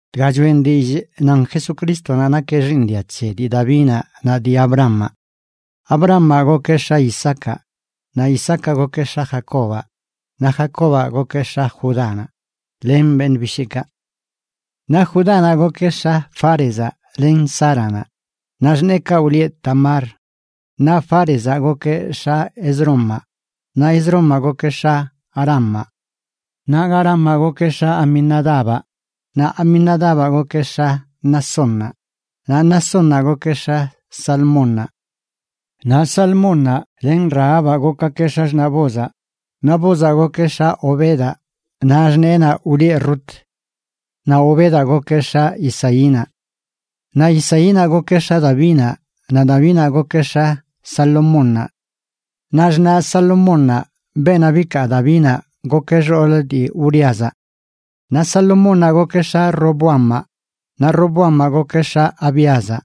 Dga choꞌen dillꞌ nan Jesucrístonaꞌ nakeꞌ xiiṉ dia c̱he dii Davinaꞌ naꞌ dii Abrahamaꞌ. Abrahamaꞌ gokeꞌ x̱a Isaacaꞌ, naꞌ Isaacaꞌ gokeꞌ x̱a Jacobaꞌ, naꞌ Jacobaꞌ gokeꞌ x̱a Judánaꞌ len beṉꞌ bisheekaꞌ. Naꞌ Judánaꞌ gokeꞌ x̱a Fárezaꞌ len Záranaꞌ, naꞌ xṉeekaꞌ wlieꞌ Tamar. Naꞌ Fárezaꞌ gokeꞌ x̱a Esrómaꞌ, naꞌ Esrómaꞌ gokeꞌ x̱a Aramaꞌ. Naꞌ Aramaꞌ gokeꞌ x̱a Aminadabaꞌ, naꞌ Aminadabaꞌ gokeꞌ x̱a Naasónnaꞌ, naꞌ Naasónnaꞌ gokeꞌ x̱a Salmónnaꞌ. Naꞌ Salmónnaꞌ len Rahabaꞌ gokgakeꞌ x̱axṉaꞌ Boozaꞌ. Naꞌ Boozaꞌ gokeꞌ x̱a Obedaꞌ naꞌ xṉeenaꞌ wlieꞌ Rut. Naꞌ Obedaꞌ gokeꞌ x̱a Isaínaꞌ. Naꞌ Isaínaꞌ gokeꞌ x̱a Davinaꞌ, naꞌ Davinaꞌ gokeꞌ x̱a Salomónnaꞌ. Naꞌ xṉaꞌ Salomónnaꞌ, beenaꞌ bikaa Davinaꞌ, gokeꞌ xool dii Uríazaꞌ. Naꞌ Salomónnaꞌ gokeꞌ x̱a Roboamaꞌ, naꞌ Roboamaꞌ gokeꞌ x̱a Abíazaꞌ,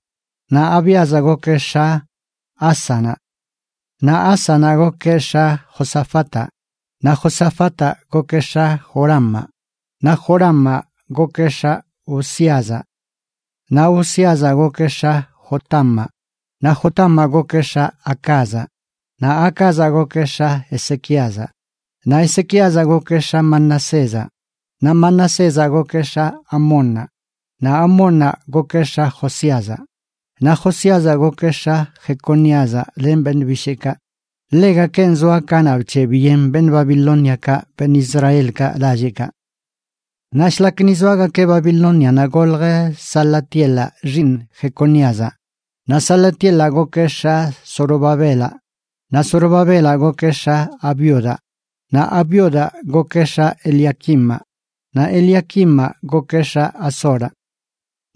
naꞌ Abíazaꞌ gokeꞌ x̱a Ásanaꞌ. Naꞌ Ásanaꞌ gokeꞌ x̱a Josafataꞌ, naꞌ Josafataꞌ gokeꞌ x̱a Joramaꞌ, naꞌ Joramaꞌ gokeꞌ x̱a Uzíazaꞌ. Naꞌ Uzíazaꞌ gokeꞌ x̱a Jotamaꞌ, naꞌ Jotamaꞌ gokeꞌ x̱a Acazaꞌ, naꞌ Acazaꞌ gokeꞌ x̱a Ezequíazaꞌ. Naꞌ Ezequíazaꞌ gokeꞌ x̱a Manasézaꞌ, naꞌ Manasézaꞌ gokeꞌ x̱a Amónnaꞌ, naꞌ Amónnaꞌ gokeꞌ x̱a Josíazaꞌ. Naꞌ Josíazaꞌ gokeꞌ x̱a Jeconíazaꞌ len beṉꞌ bisheekaꞌ, ḻegakenꞌ zoa kanaꞌ bc̱heꞌbyen beṉꞌ Babilóniakaꞌ beṉꞌ Israelkaꞌ lalleꞌkaꞌ. Naꞌ shlak ni zoagakeꞌ Babilónianaꞌ golj Salatielaꞌ xiiṉ Jeconíazaꞌ, naꞌ Salatielaꞌ gokeꞌ x̱a Zorobabelaꞌ. Naꞌ Zorobabelaꞌ gokeꞌ x̱a Abiudaꞌ, naꞌ Abiudaꞌ gokeꞌ x̱a Eliaquimaꞌ, naꞌ Eliaquimaꞌ gokeꞌ x̱a Azoraꞌ.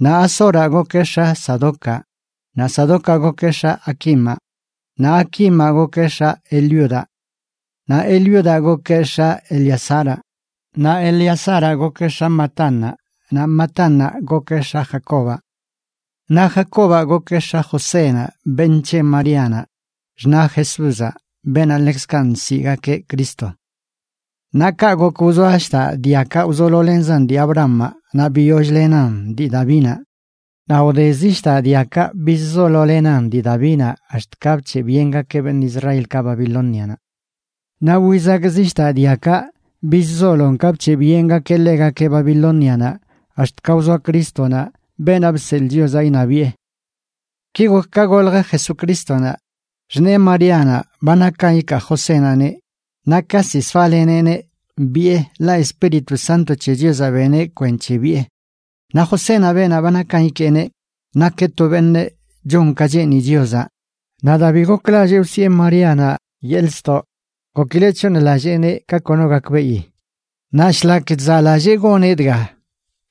Naꞌ Azoraꞌ gokeꞌ x̱a Sadocaꞌ, naꞌ Sadocaꞌ gokeꞌ x̱a Aquimaꞌ, naꞌ Aquimaꞌ gokeꞌ x̱a Eliudaꞌ. Naꞌ Eliudaꞌ gokeꞌ x̱a Eleazaraꞌ, naꞌ Eleazaraꞌ gokeꞌ x̱a Matánnaꞌ, naꞌ Matánnaꞌ gokeꞌ x̱a Jacobaꞌ. Naꞌ Jacobaꞌ gokeꞌ x̱a Josénaꞌ beṉꞌ c̱he Maríanaꞌ, xṉaꞌ Jesúzaꞌ, beenaꞌ ḻekzkaꞌ nsiꞌgakeꞌ Cristo. Naꞌ kaꞌ gok wzoa shdaꞌ diakaꞌ wzololenzan dii Abrahamaꞌ naꞌ biyoll-lenan dii Davinaꞌ. Naꞌ wde zi shdaꞌ diakaꞌ bizzololenan dii Davinaꞌ ax̱t ka bc̱heꞌbyengakeꞌ beṉꞌ Israelkaꞌ Babilónianaꞌ. Naꞌ wizak zi shdaꞌ diakaꞌ bizzolon ka bc̱heꞌbyengakeꞌ ḻegakeꞌ Babilónianaꞌ ax̱t ka wzoa Crístonaꞌ, beenaꞌ bseḻꞌ Chiozaꞌ iṉabiꞌe. Ki gok ka golj Jesucrístonaꞌ: Xṉee Maríanaꞌ ba nakan ikaa Josénaꞌneꞌ, naꞌ ka ziꞌ soaleneꞌneꞌ biꞌe, ḻaꞌ Espíritu Santo c̱he Chiozaꞌ beneꞌ kwenc̱he biꞌe. Naꞌ Josénaꞌ beenaꞌ ba nakan ikeeneꞌ, nakeꞌ to beṉꞌ chon ka cheeni Chiozaꞌ, naꞌ daa bi goklallee wsiꞌe Maríanaꞌ yeḻꞌ ztoꞌ gokileꞌ c̱hooṉlalleeneꞌ ka kono gakbeꞌi. Naꞌ shlak chzaꞌlallee goneꞌ dga,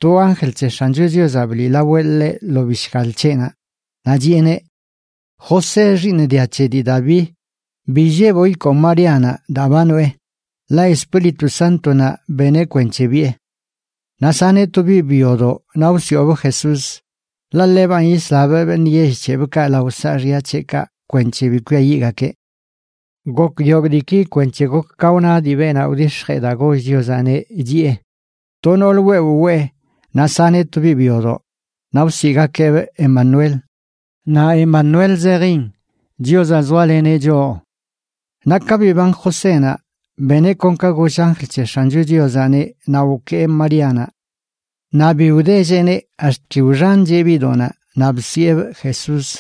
to anjl c̱he X̱ancho Chiozaꞌ bliꞌlaweꞌ ḻeꞌ lo bishgal c̱heꞌnaꞌ, naꞌ chiꞌeneꞌ: ―José, xiiṉ dia c̱he dii Daví, bi illeboꞌ ikoo Maríanaꞌ daa ba noꞌe, ḻaꞌ Espíritu Sántonaꞌ beneꞌ kwenc̱he biꞌe. Naꞌ saneꞌ to biꞌ byodoꞌ naꞌ wsiꞌobꞌ Jesús, ḻaꞌ ḻebanꞌ yislabꞌ beṉꞌ yell c̱hebꞌkaꞌ lao saaxya c̱heꞌkaꞌ kwenc̱he bi kwiayiꞌgakeꞌ. Gok yogꞌ diiki kwenc̱he gok ka wna dii beenaꞌ wdix̱jee daa goll Chiozaꞌneꞌ, chiꞌe: To nool wewꞌ wee, naꞌ saneꞌ to biꞌ byodoꞌ, naꞌ wsiꞌgakeꞌbꞌ Emanuel. Naꞌ Emanuel zejin: Chiozaꞌ zoaleneꞌ choꞌ. Naꞌ ka biban Josénaꞌ, beneꞌ kon ka goll anjl c̱he X̱ancho Chiozaꞌneꞌ naꞌ wkee Maríanaꞌ. Naꞌ bi wdelleꞌneꞌ ax̱t ki wxancheꞌ biꞌdoꞌnaꞌ, naꞌ bsiꞌebꞌ Jesús.